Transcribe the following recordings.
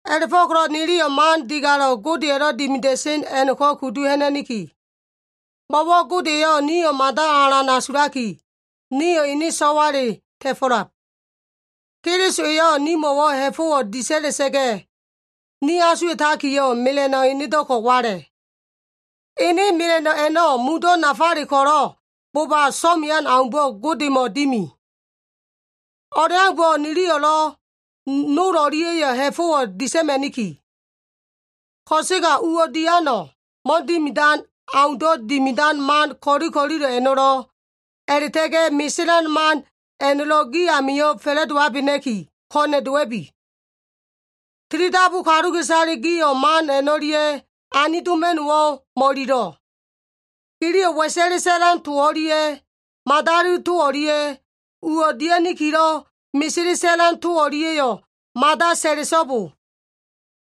A꞉la꞉fo꞉ko꞉lo꞉ niliyo꞉ man digalo꞉ Godeya꞉lo꞉ dimida꞉sen a꞉no꞉ko꞉ kudu ha꞉na꞉niki. Mo꞉wo꞉ Gode eyo꞉ nio꞉ mada alan asulaki, nio꞉ ene so꞉wale ta꞉fo꞉lab. Keliso eyo꞉ nimo꞉wo꞉ ha꞉fo꞉wo꞉ disa꞉la꞉sa꞉ga꞉, ni asuwa꞉takiyo꞉ mela꞉no꞉ enedo꞉ko꞉ wala꞉. Ene mela꞉no꞉ a꞉no꞉ mundo꞉ nafale ko꞉lo꞉ bo꞉ba so꞉mean aumbo꞉ Godemo꞉ dimi. O꞉leaumbo꞉ niliyo꞉lo꞉ nol o꞉lia꞉yo꞉ ha꞉fo꞉wo꞉ disa꞉ma꞉niki. Ko꞉sega uwo꞉ diano꞉, mo꞉dimidan aundo꞉ dimidan man ko꞉li ko꞉lilo꞉ a꞉no꞉lo꞉, a꞉la꞉ta꞉ga꞉ meselan man a꞉no꞉lo꞉ gi amio꞉ fa꞉la꞉dowabena꞉ki, ko꞉na꞉ dowa꞉bi. Tilidabu kaluka꞉isale gio꞉ man a꞉no꞉lia꞉ anidoma꞉no꞉wo꞉ mo꞉ililo꞉. Giliyo꞉ wa꞉sa꞉le sa꞉lan to o꞉lia꞉, madali to o꞉lia꞉, uwo꞉ dia꞉nikilo꞉ mesele sa꞉lan to o꞉lia꞉yo꞉ mada sa꞉la꞉so꞉bo.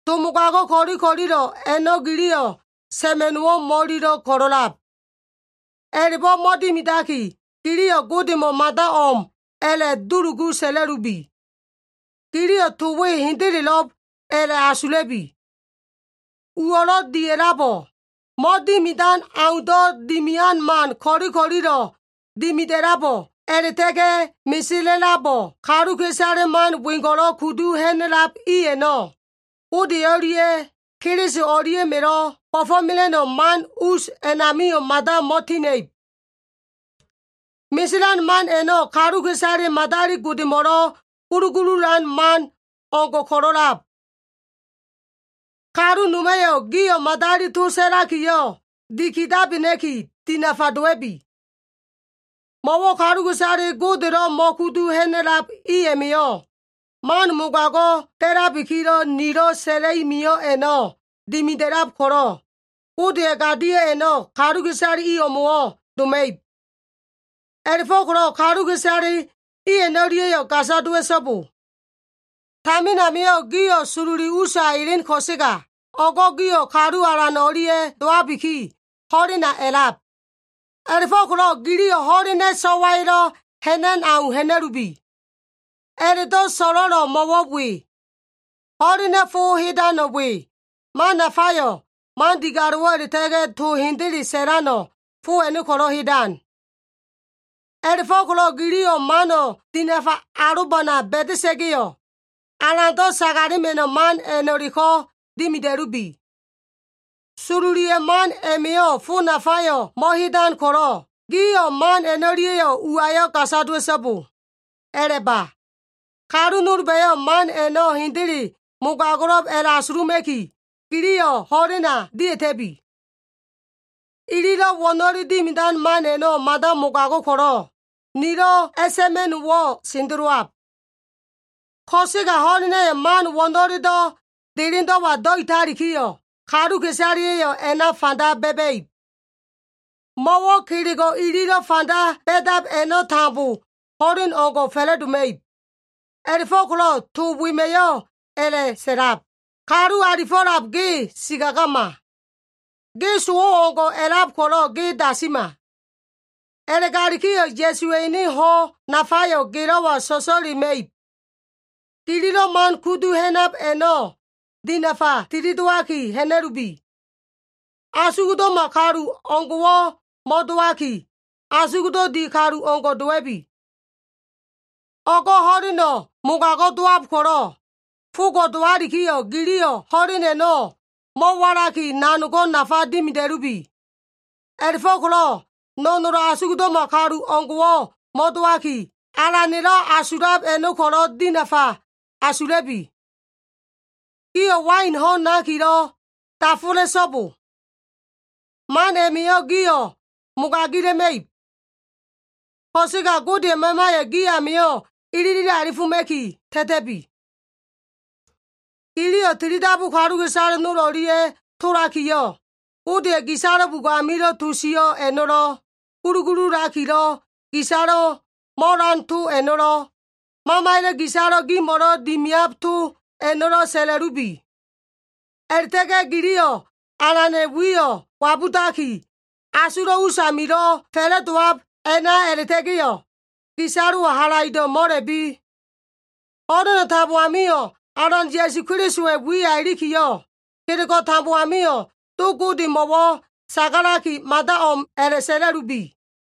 To mogago꞉ ko꞉li ko꞉lilo꞉ a꞉no꞉ giliyo꞉ sa꞉ma꞉no꞉wo꞉ mo꞉ililo꞉ ko꞉lo꞉lab. A꞉la꞉bo꞉ mo꞉dimidaki, giliyo꞉ Godemo꞉ mada o꞉m a꞉la꞉dulugu sa꞉la꞉lubi. Giliyo꞉ to we hendelelo꞉b a꞉la꞉ asula꞉bi. Uwo꞉lo꞉ dia꞉labo꞉, mo꞉dimidan aundo꞉ dimian man ko꞉li ko꞉lilo꞉ dimida꞉labo꞉, a꞉la꞉ta꞉ga꞉ mesela꞉labo꞉, kaluka꞉isale man wengo꞉lo꞉ kudu ha꞉na꞉lab i a꞉no꞉, Gode o꞉lia꞉ Keliso o꞉lia꞉ma꞉lo꞉ bo꞉fo꞉mela꞉no꞉ man us a꞉namio꞉ mada mo꞉tina꞉ib. Meselan man a꞉no꞉ kaluka꞉isale madali godemo꞉lo꞉ gulugululan man o꞉ngo꞉ ko꞉lo꞉ a꞉lab. Kalu noma꞉yo꞉ gio꞉ madali to sa꞉lakiyo꞉ dikidabena꞉ki dinafa dowa꞉bi. Mo꞉wo꞉ kaluka꞉isale Godelo꞉ mo꞉kudu ha꞉na꞉lab i a꞉ma꞉yo꞉, man mogago꞉ nilo꞉ sa꞉la꞉i mio꞉ a꞉no꞉ dimida꞉lab ko꞉lo꞉, Godeya꞉ gadio꞉ a꞉no꞉ kaluka꞉isale i o꞉mo꞉wo꞉ doma꞉ib. A꞉la꞉fo꞉ko꞉lo꞉ kaluka꞉isale i a꞉no꞉lia꞉yo꞉ gasa dowa꞉so꞉bo. Tamin amio꞉ gio꞉ sololi usa elen ko꞉sega, o꞉go꞉ gio꞉ Kalu Alan o꞉lia꞉ dowabiki, ho꞉lena a꞉lab. A꞉la꞉fo꞉ko꞉lo꞉ giliyo꞉ ho꞉lena꞉ so꞉waya꞉lo꞉ ha꞉nan au ha꞉na꞉lubi. A꞉la꞉do꞉ so꞉lo꞉lo꞉ mo꞉wo꞉ we. Ho꞉lena꞉ fo hedano꞉ we, man nafayo꞉, man digalo꞉wo꞉ a꞉la꞉ta꞉ga꞉ to hende sa꞉lano꞉, fo a꞉no꞉ ko꞉lo꞉ hedan. A꞉la꞉fo꞉ko꞉lo꞉ giliyo꞉ mano꞉ dinafa alobana ba꞉da꞉sa꞉ga꞉yo꞉, Alando꞉ sagalema꞉no꞉ man a꞉no꞉leko꞉ dimida꞉lubi. Sololiya꞉ man a꞉ma꞉yo꞉ fo nafayo꞉ mo꞉hedan ko꞉lo꞉, gio꞉ man a꞉no꞉lia꞉yo꞉ uwayo꞉ gasa dowa꞉so꞉bo. A꞉la꞉ba. Kalu nolba꞉yo꞉ man a꞉no꞉ hendele mogago꞉lo꞉b a꞉la꞉asuluma꞉ki, giliyo꞉ ho꞉lena dia꞉ta꞉bi. Ililo꞉ wo꞉no꞉lelo꞉ dimidan man a꞉no꞉ mada mogago꞉ ko꞉lo꞉, nilo꞉ a꞉sa꞉ma꞉no꞉wo꞉ sendelowab. Ko꞉sega ho꞉lena꞉yo꞉ man wo꞉no꞉lelo꞉ delendo꞉wa do꞉italikiyo꞉, kaluka꞉isaleya꞉yo꞉ a꞉na fanda ba꞉ba꞉ib. Mo꞉wo꞉ kelego꞉ ililo꞉ fanda ba꞉dab a꞉no꞉ tambo ho꞉len o꞉ngo꞉ fa꞉la꞉doma꞉ib. A꞉la꞉fo꞉ko꞉lo꞉ to wema꞉yo꞉ a꞉la꞉sa꞉lab, “Kalu alifo꞉lab ge sikagama. Ge sowo꞉ o꞉ngo꞉ a꞉lab ko꞉lo꞉, ge dasima. A꞉la꞉galikiyo꞉ Ya꞉suwa꞉ ene ho꞉ nafayo꞉ gelo꞉wa so꞉so꞉lema꞉ib.” Gililo꞉ man kudu ha꞉nab a꞉no꞉ dinafa tilidowaki ha꞉na꞉lubi. Asugdo꞉ma kalu o꞉ngo꞉wo꞉ mo꞉dowaki, asugdo꞉ di kalu o꞉ngo꞉ dowa꞉bi. O꞉go꞉ ho꞉leno꞉ mogago꞉ dowab ko꞉lo꞉, fogo꞉ dowalikiyo꞉ giliyo꞉ ho꞉len a꞉no꞉ mo꞉walaki nanogo꞉ nafa dimida꞉lubi. A꞉la꞉fo꞉ko꞉lo꞉ no꞉nolo꞉ asugdo꞉ma kalu o꞉ngo꞉wo꞉ mo꞉dowaki, Alana꞉lo꞉ asulab a꞉no꞉ ko꞉lo꞉ dinafa asula꞉bi. Gio꞉ wain ho꞉n nakiyo꞉ dafola꞉so꞉bo. Man a꞉ma꞉yo꞉ gio꞉ mogagila꞉ma꞉ib. Ko꞉sega Godeya꞉ Mamayo꞉ gi amio꞉ ilili alifoma꞉ki ta꞉ta꞉bi. Giliyo꞉ tilidabu kaluka꞉isale nol o꞉lia꞉ tolakiyo꞉, Godeya꞉ gisalo꞉ bugo꞉ amilo꞉ to sio꞉ a꞉no꞉lo꞉, gulugululakilo꞉ gisalo꞉ mo꞉lan to a꞉no꞉lo꞉, Mamaya꞉ gisalo꞉ gimo꞉lo꞉ dimiab to a꞉no꞉lo꞉ sa꞉la꞉lubi. A꞉la꞉ta꞉ga꞉ giliyo꞉ Alana꞉ wiyo꞉ wabudaki, asulo꞉ usamilo꞉ fa꞉la꞉dowab a꞉na a꞉la꞉ta꞉ga꞉yo꞉, gisalo꞉wo꞉ halaido꞉ mo꞉la꞉bi. Ho꞉leno꞉ tambo amio꞉ Alan Ya꞉su Kelisowa꞉ wiya ilikiyo꞉, kelego꞉ tambo amio꞉ Do Godemo꞉wo꞉ sagalaki, mada o꞉m a꞉la꞉sa꞉la꞉lubi.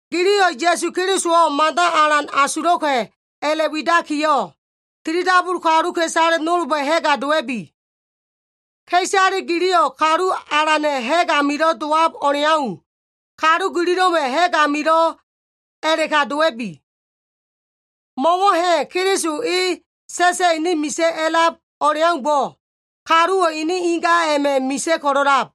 Giliyo꞉ Ya꞉su Kelisowo꞉ mada alan asulo꞉ka꞉ a꞉la꞉widakiyo꞉, tilidabu kaluka꞉isale nolba꞉ ha꞉ga dowa꞉bi. Ka꞉isale giliyo꞉ Kalu Alana꞉ ha꞉g amilo꞉ dowab o꞉leau, kalu gililo꞉ma꞉ ha꞉g amio꞉lo꞉ a꞉la꞉ka dowa꞉bi. Mo꞉wo꞉ ha꞉ Keliso e sa꞉sa꞉ ene misa꞉ a꞉lab o꞉leaumbo꞉, kaluwo꞉ ene inga a꞉ma꞉ misa꞉ ko꞉lo꞉lab.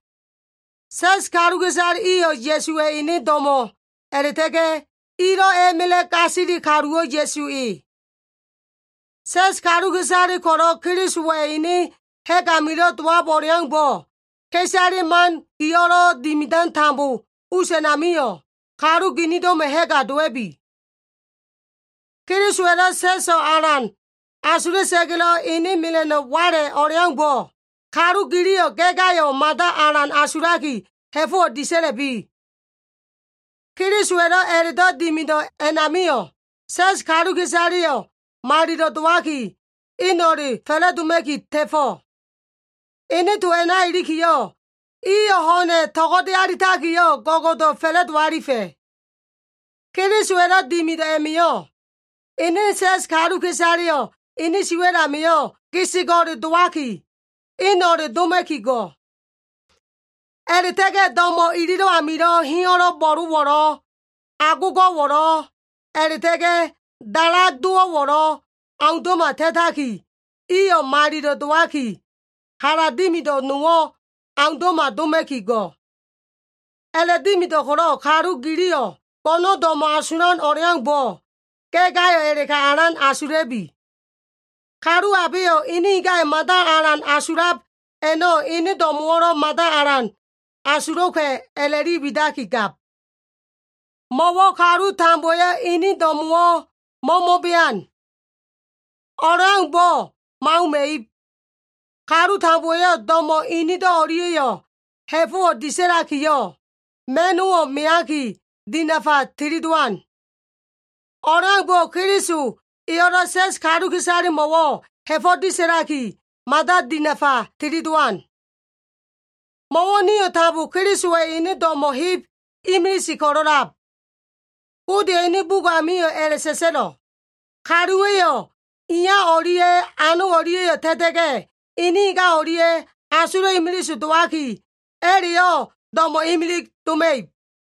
Sa꞉s kaluka꞉isale iyo꞉ Ya꞉suwa꞉ ene do꞉mo꞉ a꞉la꞉ta꞉ga꞉, ilo꞉ a꞉ma꞉la꞉ gasili kaluwo꞉ Ya꞉su e. Sa꞉s kaluka꞉isale ko꞉lo꞉ Kelisowa꞉ ene ha꞉g amilo꞉ dowab o꞉leaumbo꞉, ka꞉isale gililo꞉ man dimidan us a꞉namio꞉, kalu ginindo꞉ma꞉ ha꞉ga dowa꞉bi. Kelisowa꞉lo꞉ sa꞉so꞉ alan asula꞉sa꞉ga꞉lo꞉ ene mela꞉no꞉ wala꞉ o꞉leaumbo꞉, kalu giliyo꞉ ga꞉ gayo꞉ mada alan asulaki ha꞉fo꞉wo꞉ disa꞉la꞉bi. Kelisowa꞉lo꞉ a꞉la꞉do꞉ dimido꞉ a꞉namio꞉, sa꞉s kaluka꞉isaleyo꞉ malilo꞉ dowaki eno꞉le fa꞉la꞉doma꞉ki ta꞉fo꞉. Ene to a꞉na ilikiyo꞉, iyo꞉ ho꞉na꞉ to꞉go꞉de alitakiyo꞉, go꞉go꞉do꞉ fa꞉la꞉do alifa꞉. Kelisowa꞉lo꞉ dimido꞉ a꞉ma꞉yo꞉, ene sa꞉s kaluka꞉isaleyo꞉ ene siwa꞉l amio꞉ gesego꞉le dowaki, eno꞉le doma꞉ki go꞉. A꞉la꞉ta꞉ga꞉ do꞉mo꞉ ililo꞉ amilo꞉ heyo꞉lo꞉ bo꞉lo꞉wo꞉lo꞉, agogo꞉wo꞉lo꞉, a꞉la꞉ta꞉ga꞉ dalagdo꞉wo꞉lo꞉ aundo꞉ma ta꞉taki, iyo꞉ malilo꞉ dowaki, hala dimido꞉ nowo꞉ aundo꞉ma doma꞉ki go꞉. A꞉la꞉dimido꞉ ko꞉lo꞉ kalu giliyo꞉ go꞉no꞉ do꞉mo꞉ asulan o꞉leaumbo꞉, ga꞉ gayo꞉ a꞉la꞉ka alan asula꞉bi. Kalu abeyo꞉ ene ingayo꞉ mada alan asulab a꞉no꞉ ene do꞉mo꞉wo꞉lo꞉ mada alan asulo꞉ka꞉ a꞉la꞉li widakigab. Mo꞉wo꞉ kalu tambowa꞉yo꞉ inin do꞉mo꞉wo꞉ mo꞉mo꞉bean. O꞉leaumbo꞉ mo꞉auma꞉ib. Kalu tambowa꞉yo꞉ do꞉mo꞉ inido꞉ o꞉lia꞉yo꞉ ha꞉fo꞉wo꞉ disa꞉lakiyo꞉, ma꞉no꞉wo꞉ meaki, dinafa tilidowan. O꞉leaumbo꞉ Keliso eyo꞉lo꞉ sa꞉s kaluka꞉isalemo꞉wo꞉ ha꞉fo꞉ disa꞉laki, mada dinafa tilidowan. Mo꞉wo꞉ nio꞉ tambo Kelisowa꞉ ene do꞉mo꞉ heb imilise ko꞉lo꞉lab. Godeya꞉ ene bugo꞉ amio꞉ a꞉la꞉sa꞉sa꞉lo꞉, “kaluwa꞉yo꞉ iya o꞉lia꞉ ano o꞉lia꞉yo꞉ ta꞉ta꞉ga꞉, ene inga o꞉lia꞉ asulo꞉ imilise dowaki, a꞉la꞉yo꞉ do꞉mo꞉ imilise doma꞉ib.”